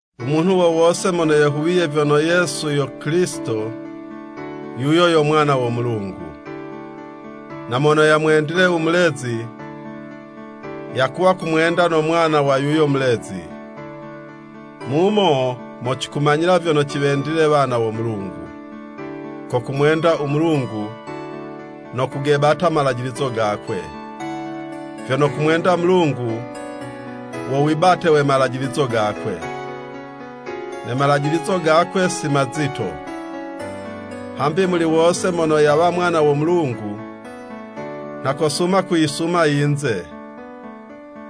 U munhu wo wose mono yehuwiye vyono Yesu yo Kilisito, yuyo yo mwana wo Mulungu, na mono yamwendile u mulezi, yakuwa kumwenda no mwana wa yuyo mulezi. Mumo mo cikumanyila vyono ciwendile wana wo Mulungu, ko kumwenda u Mulungu no kugebata malajilizo gakwe, vyono kumwenda Mulungu, wo wibate we malajilizo gakwe. Ne malajilizo gakwe si mazito. Hambi muli wose mono yawa mwana wo Mulungu nha kosuma kuyisuma i yinze.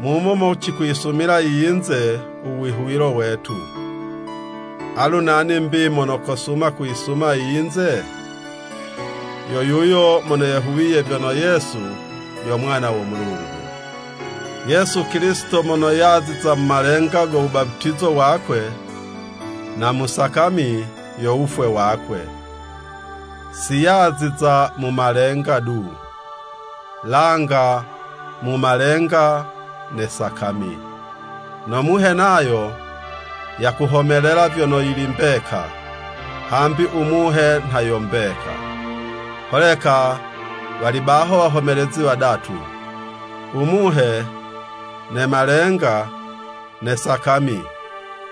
Mumo mo cikuyisumila i yinze, u wihuwilo wetu. Alu nani 'mbi mono kosuma kuyisuma i yinze? Yo yuyo mono yehuwiye vyono Yesu yo Mwana wo Mulungu. Yesu Kilisito mono yaziza mu malenga go wubaputizo wakwe na mu sakami yo wufwe wakwe. Siyaziza mu malenga du, langa mu malenga ne sakami. No Muhe nayo yakuhomelela vyono yili mbeka, hambi u Muhe nha yo mbeka. Holeka wali baho wahomelezi wadatu. U Muhe, ne malenga, ne sakami,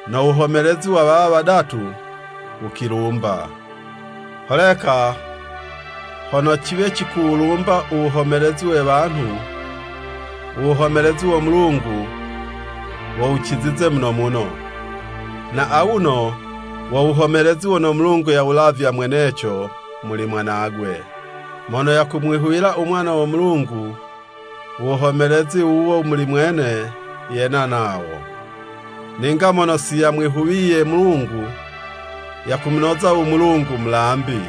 no wuhomelezi wa wawa wadatu wukilumba. Holeka hono ciwe cikuwulumba u wuhomelezi we wanhu, u wuhomelezi wo Mulungu wo wucizize muno muno, na awuno wo wuhomelezi wono Mulungu yawulavya mweneco muli Mwanagwe. Mono yakumwihuwila u Mwana wo Mulungu, u wuhomelezi wuwo muli mwene yena nawo, ninga mono siyamwihuwiye Mulungu, yakumunoza u Mulungu mulambi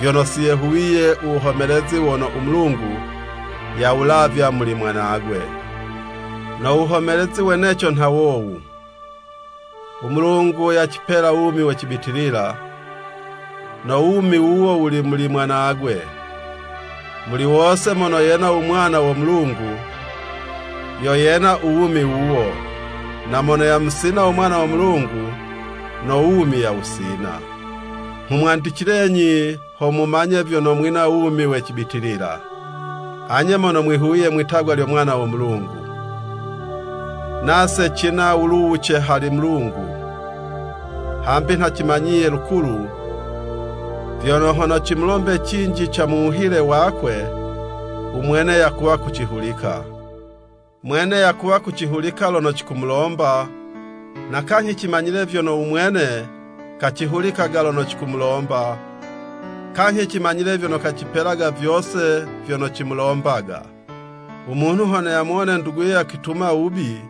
vyono siyehuwiye u wuhomelezi wono u Mulungu yawulavya muli Mwanagwe. No wuhomelezi weneco nha wowu: U Mulungu yacipela wumi we cibitilila, no wumi wuwo wuli muli Mwanagwe. Muli wose mono yena u Mwana wo Mulungu, yo yena u wumi wuwo, na mono yamusina u Mwana wo Mulungu, no wumi yawusina. Nghumwandicilenyi ho mumanye vyono mwina wumi we cibitilila, anye mono mwihuwiye mwitagwa lyo Mwana wo Mulungu, Nase cina wuluwuce hali Mulungu, hambi nha cimanyiye lukulu vyono hono cimulombe cinji ca mu wuhile wakwe, u Mwene yakuwa kucihulika. Mwene yakuwa kucihulika lono cikumulomba, na kanyhi cimanyile vyono u mwene kacihulikaga lono cikumulomba, kanyhi cimanyile vyono kacipelaga vyose vyono cimulombaga. U munhu hono yamuwone nduguye yakwituma wubi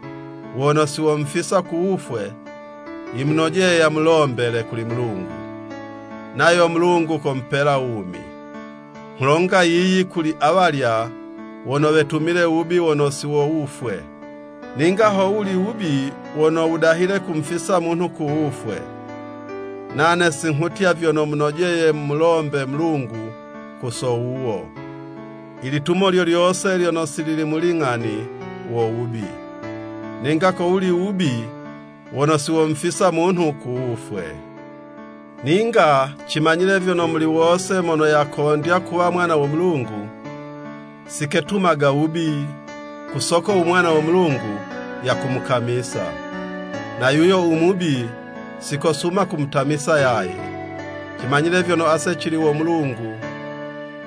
wono siwomufisa ku wufwe, yimunojeye yamulombele kuli Mulungu, nayo Mulungu komupela wumi. Nghulonga yiyi kuli awalya wono wetumile wubi wono si wo wufwe. Ninga ho wuli u wubi wono wudahile kumufisa munhu ku wufwe, nane singhutya vyono munojeye mumulombe Mulungu ku so wuwo. I litumo lyo lyose lyono si lili mu ling'ani, wo wubi, ninga ko wuli wubi wono siwomufisa munhu ku wufwe. Ninga cimanyile vyono muli wose mono yakondya kuwa mwana wo Mulungu, siketumaga wubi, ku soko u Mwana wo Mulungu yakumukamisa. Na yuyo u Mubi si kosuma kumutamisa yaye. Cimanyile vyono ase cili wo Mulungu,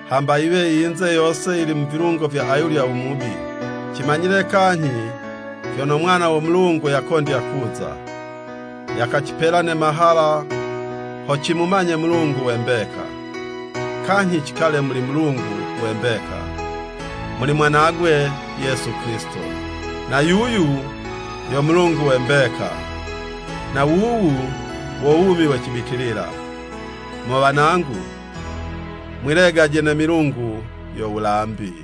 hamba yiwe i yinze yose yili mu vilungo vya ayulya u Mubi. Cimanyile kanyhi, vyono Mwana wo Mulungu yakondya kuza, yakacipela ne mahala ho cimumanye Mulungu we mbeka, kanyhi cikale muli Mulungu we mbeka, muli Mwanagwe Yesu Kilisito. Na yuyu yo Mulungu we mbeka, na wuwu wo wumi we cibitilila. Mo wanangu, mwilegaje ne milungu yo wulambi!